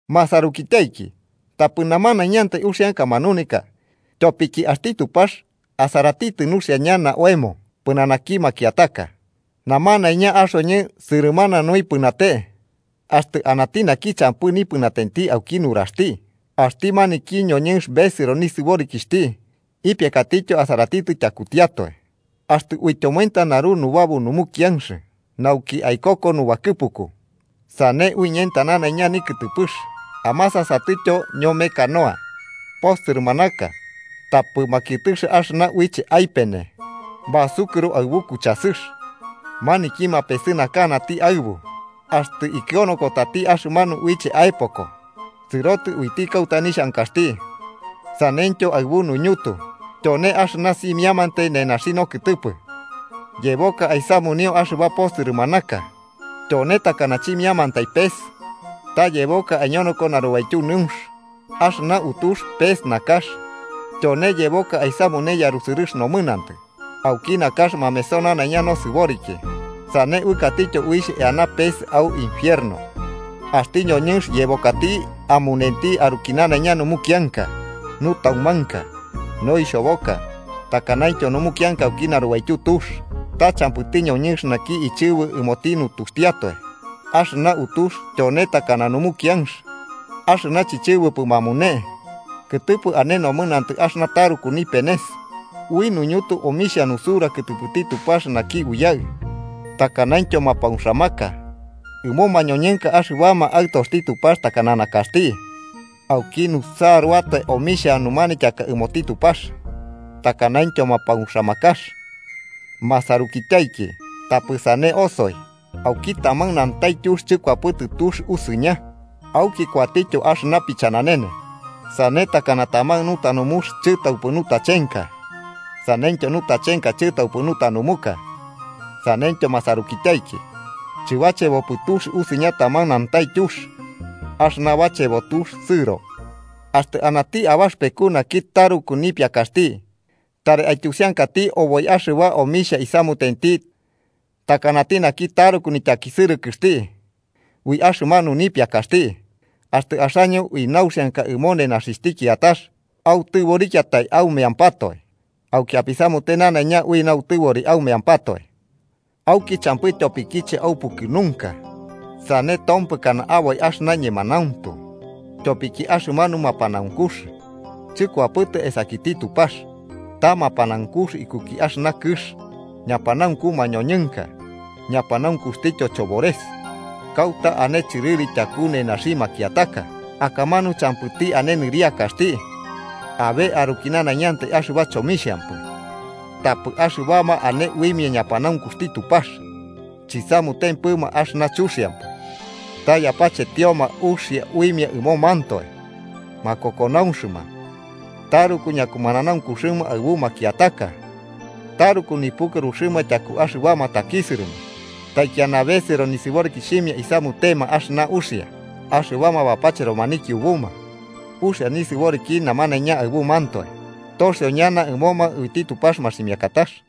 Masarukityaiki, tapɨ namanañantai uxianka manuneka. Tyopiki axti Tupax asaratitɨ nuxia ñana oemo pɨnanaki makiataka. Namanaiña axoñɨ sɨrɨmana nuipɨnate, axtɨ anati naki champɨ nipɨnatenti auki nuraxti, axti maniki ñoñɨnx besɨro nisɨborikixhti, ipiakatityo asaratitɨ tyakutiatoe. Axtɨ uityomoenta naru nubabu numukianx nauki aikoko nubakɨpuku, sane uiñenta nanaiña nikɨtɨpɨx. Amasasatɨtyo ñome canoa: posɨrɨmanaka tapɨ makiɨtɨx axɨna uiche aipene basukurɨro aɨbu kuchasɨx, maniki mapesɨnakana aɨbu axtɨ ikɨonokotati axɨmanu uiche aepoko sɨrotɨ uiti kauta nixhankaxti. Saneityo aɨbu nuñutu. Tyone axɨna simiamantai nenaxi nokɨtɨpɨ, yeboka aisamunio axɨba posɨrɨmanaka. ¡Tyone takana chimiantai pes ta yeboka aiñonoko narubaityu nɨunx! Axɨna utux pes nakax. Tyone yeboka aisamune yarusɨrɨx nomɨnantɨ. Auki nakax mameso nanaiña nosɨboriki, sane uɨkatityo uixh eana pes au infierno. Axti noñɨnx yebokati amunenti aruki nanaiña numukianka, nutaumanka, noixhoboka takanaintyo numukianka auki narubaityu tux. Ta champɨti ñoñɨnx naki ichɨbɨ ɨmoti nutuxtiatoe. Axɨna utux tyone takana numukianx axɨna chichɨbɨpɨ mamune, kɨtɨpɨ ane nomɨnantɨ axɨna taruku nipenes. Ui nuñutu omixhia nusura kɨtɨpɨti Tupax naki Uyaɨ, takanaintyo mapauxamaka ɨmo mañoñɨnka axɨbama aɨtoxti Tupax takana nakaxti. Auki nusaruatoe omixhia numanityaka ɨmoti Tupax takanaintyo mapauxamakax. Masarukityaiki, tapɨ sane osoi. Auki taman nantaityux chɨkuapɨtɨ tux usɨña auki kuatityo axɨna pichananene. Sane takana taman nutanumux chɨtaupɨ nutachenka saneityo nutachanka chobɨtaupɨ nutanumuka, saneityo masarukityaiki, chɨbachebo tux usɨña taman nantaityux axɨna bachebo tux sɨro. Axtɨ anati abaxɨpeku naki taruku nipiakaxti, tari aityusiankati oboi axɨba omixhia isamutenti, takanati naki taruku nityakisɨrɨkɨxti ui axɨmanu nipiakaxti. Axtɨ axaño ui nauxianka ɨmo nenaxixhti kiatax autɨborikiatai aumeampatoe, auki apisamute nanaiña ui nautɨbori aumeampatoe, auki champɨ tyopokiche aupukɨnunka sane tompɨkana aboi axɨna ñemanauntu. Tyopiki axɨmanu mapanaunkux chɨkuapɨtɨ esakiti Tupax, ta mapanaunkux ikuki axɨna kɨx, ñapanaunku mañoñɨnka ñapanaunkuxtityo chobores. Kauta ane chɨrɨri tyaku nenaxi makiataka, akamanu champɨti ane nɨriakaxti abe aruki nanaiñantai axɨba chomixhampɨ. Tapɨ axɨbama ane uimia ñapanaunkuxti Tupax, chisamutempɨma axɨna chuxiampɨ ta yapachetioma uxia uimia ɨmomantoe, makokonaunxɨma, taruku ñakumananaunkuxɨma aɨbu makiataka. Taruku nipukɨruxɨma tyaku axɨbama takisɨrɨma, taikiana besɨro nisɨborikixhimia isamutema axɨna uia. Axɨbama bapacheroma nikiubuma uxia nisɨboriki namanaiña aɨbumantoe, toxio ñana ɨmoma uiti Tupax maximiakatax.